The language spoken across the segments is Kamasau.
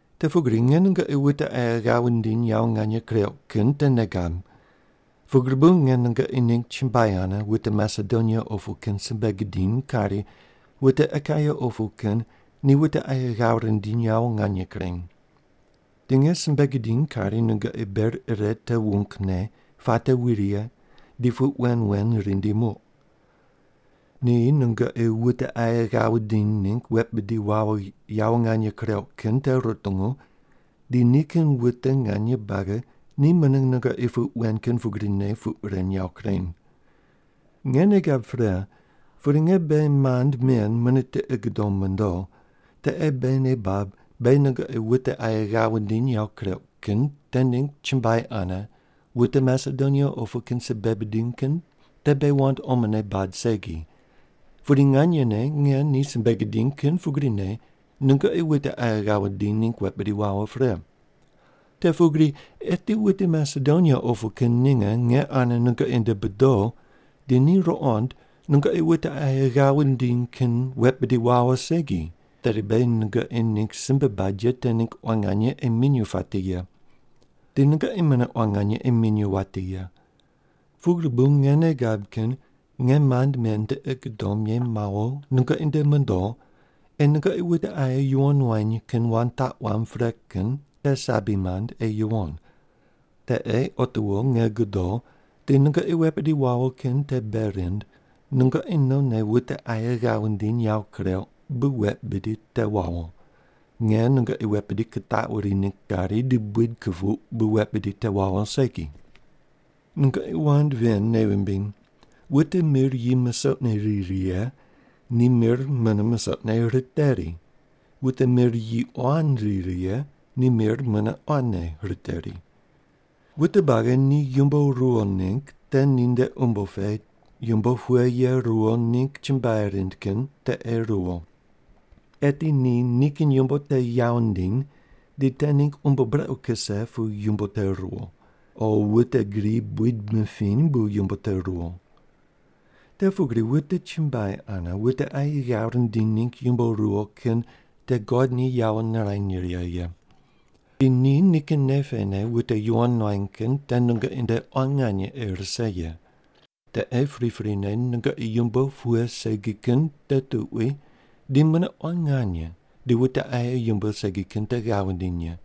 Te pugri nge nungoqi wute aye ghav wundiny yawo nganye kureuq kin te nei gab, pugri bu nge nungoqi ningg chumbuai ane wute Masedonia opu kin simbe gidiny kari, “Wute Akaia opu kin ni wute aye ghav rindiny yawo nganye kureny.” Di nge simbe gidiny kari nungoqi ber ire te wungne puate wi righe di puq wen wen rindi muq. Ni nungoqi wute aye ghav wundiny ningg wet bidi wawo yawo nganye kureuq kin te rutungu di nikin wute nganye buagi ni mune nungoqi puq wen kin pugrine puq ren yawo kureny. Nge nei gab pre, pudi nge beghi mand men mune tiqi gudom mondo, te ei beghi nei bab beghi nungoqi wute aye ghav wundiny yawo kureuq kin te ningg chumbuai ane wute Masedonia opu kin simbe bidiny kin te beghi wand omone bad segi, pudi nganyene nge ni simbe gidiny kin pugrine nungoqi wute aye ghav wundiny ningg wet bidi wawo pre. Te pugri eti wute Masedonia opu kin ninge nge ane nungoqi nde bodo di ni ruqond nungoqi wute aye ghav wundiny kin wet bidi wawo segi, tedi beghi nungoqi ningg simbe bad ye te ningg quan nganye ei minyuw pati ye. Di nungoqi mune quan nganye ei minyuw wati ye. Pugri bu nge nei gab kin nge mand men tiqi gudom ye mawo nungoqi nde mondo ei nungoqi wute aye yuwon wany kin wand taq wamb pre kin te sabi mand ei yuwon. Te ei otiwo nge godo di nungoqi wet bidi wawo kin te bei rind nungoqi nonne wute aye ghav wundiny yawo kureuq bu wet bidi te wawo, nge nungoqi wet bidi kitaquri ningg kari di buid kupuq bu wet bidi te wawo segi. Nungoqi wand ven nei wumbiny: Wute mir yi musoqne ri righe ni mir mune musoqne riteri, wute mir yi quan ri righe ni mir mune quanne riteri. Wute buagi ni yumbo ruwo ningg te ninde umbo pe yumbo pughe ye ruwo ningg chumbuai rind kin te ei ruwo. Eti ni nikin yumbo te yawo ndiny di te ningg umbo brequ kuse pu yumbo te ruwo, o wute gri buid mipiny bu yumbo te ruwo. Te pugri wute chumbuai ane wute aye ghav rindiny ningg yumbo ruwo kin te God ni yawo nirany righe ye. Di ni nikin nei pene wute yuwon nuany kin te nungoqi nde quan nganye ei rise ye. Te ei priprine nungoqi yumbo pughe segi kin te tuqui di mune quan nganye di wute aye yumbo segi kin te ghav wundiny ye.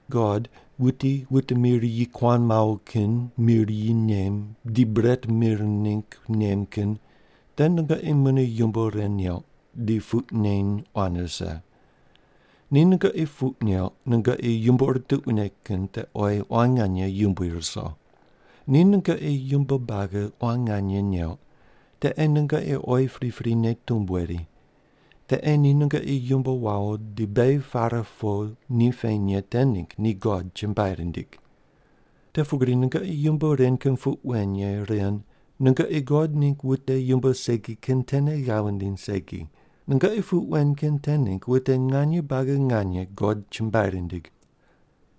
God, wuti wute mir yi kuan mawo kin mir yi nem di bret mir ningg nem kin te nungoqi mune yumbo ren neuq di puq neny quan rise. Ni nungoqi puq neuq nungoqi yumbo ur tuquine kin te oyi quan nganye yumbui ruso. Ni nungoqi yumbo buagi quan nganye neuq, te ei nungoqi oyi priprine tumb weri. Te ei ni nungoqi yumbo wawo di beghi pare po ni peny ye te ningg ni God chumbuai rindig. Te pugri nungoqi yumbo ren kin puq wen ye ren nungoqi God ningg wute yumbo segi kin tene ghav wundiny segi, nungoqi puq wen kin te ningg wute nganye buagi nganye God chumbuai rindig.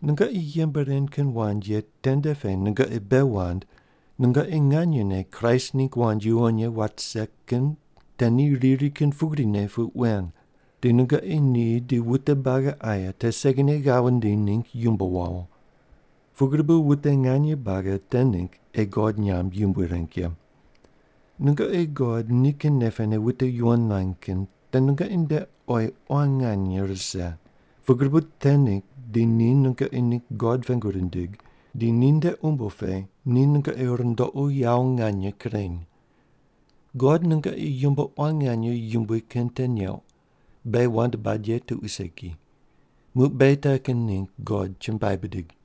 Nungoqi yembe ren kin wand ye tende pe nungoqi bei wand nungoqi nganyene Kraist ningg wand yuwon ye wat rise kin te ni riri kin pugrine puq wen, di nungoqi ni di wute buagi aye te segine ghav wundiny ningg yumbo wawo. Pugri bu wute nganye buagi te ningg ei God nyamb yumbui reng ye. Nungoqi God nikin nei pene wute yuwon nuany kin te nungoqi nde oyi quan nganye rise pugri bu te ningg di ni nungoqi ningg God pengu rindig di ninde umbo pe ni nungoqi rundoqu yawo nganye kureny. God nungoqi yumbo quan nganye yumbui kin te neuq, beghi wand bad ye tuqui segi. Muq beghi te kin ningg God chumbuai bidig.